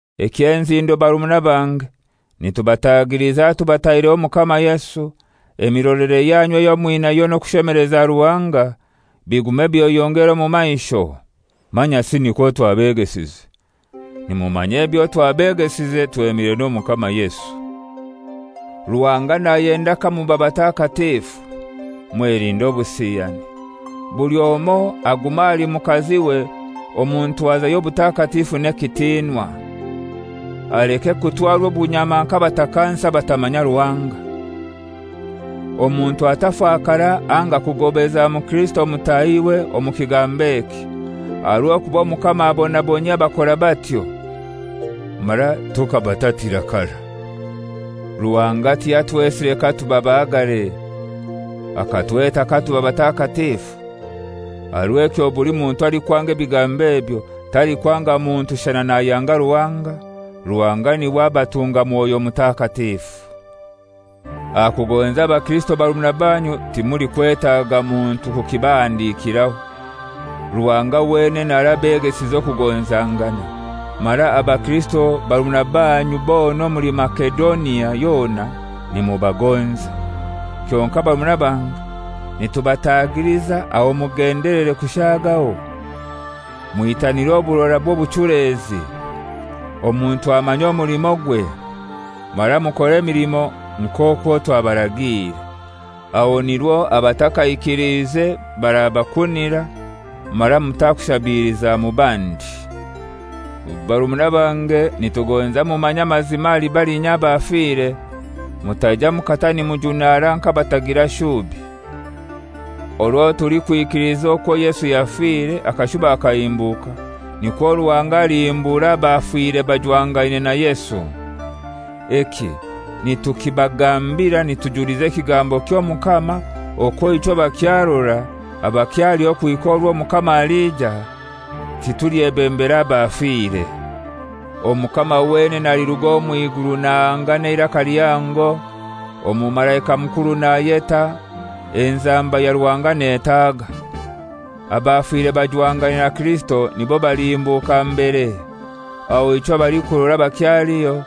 Eky'enzindo barumuna bange, nitubatagiliza tubataireho Omukama Yesu, emirolere yanyu eyo mwinayo n'okushemeleza Ruhanga bigume byeyongere omu maisho; manyasi nikwo twabegesize. Nimumanya ebyo twabegesize twemire n'Omukama Yesu. Ruhanga nayenda kamuba batakatifu: Mwelinde obusiyani. Buli omoi agume ahali mukaziwe omu ntwaza y'obutakatifu n'ekitinwa. Aleke kutwarwa obunyama nk'abatakansi abatamanya Ruhanga. Omuntu atafakara anga kugobeza mukirisito mutahiwe omu kigambo eki, aha rw'okuba Omukama abonabonyia abakora batyo. Mara tukabatatira karai. Ruhanga tiyatwesire katuba bahagare; akatweta katuba batakatifu. Aha rw'ekyo buli muntu alikwanga ebigambo ebyo, talikwanga muntu shana nayanga Ruhanga, Ruhanga niwe abatunga Mwoyo Mutakatifu. Aha kugonza abakirisito barumuna banyu timulikwetaga muntu kukibahandikiraho. Ruhanga wenene arabegesize okugonzangana, mara abakirisito barumuna banyu bona omuli Masedonia yona nimubagonza. Kyonkai barumuna bange nitubatagiliza aho mugendelere kushaagaho. Mwitanire oburora bw'obuchulezi, omuntu amanye omulimogwe, mara mukore emilimo nk'okwo twabaragiire. Aho nirwo abatakaikiliza barabakunira, mara mutakushabiliza mu bandi. Barumuna bange, nitugonza mumanye amazima ahali balinya abafire, mutaija mukata nimujunara nk'abatagira shubi. Orwo tulikwikiliza okwo Yesu yafire akashuba akahimbuka, nikwo Ruhanga alihimbura abafire bajwangaine na Yesu. Eki nitukibagambira nitujuliza ekigambo ky'Omukama, okwo ichwe abakyarora, abakyaliho kuhika orwo Omukama alija, titulyebembera abafire. Omukama wenene aliruga omw'iguru nahanga n'eiraka lihango, omumalaika mukuru nayeta, enzamba ya Ruhanga netaaga. Abafire bajwangaine na Kirisito nibo balihimbuka mbere. Aho ichwe abalikurora abakyaliho,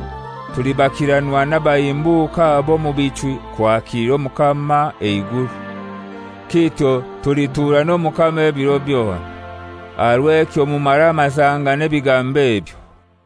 tulibakiranwa n'abahimbuke abo omu bichwi kwakilira Omukama eiguru. Kityo tulituura n'Omukama ebiro byona. Aha rw'ekyo mumaramazangane ebigambo ebyo.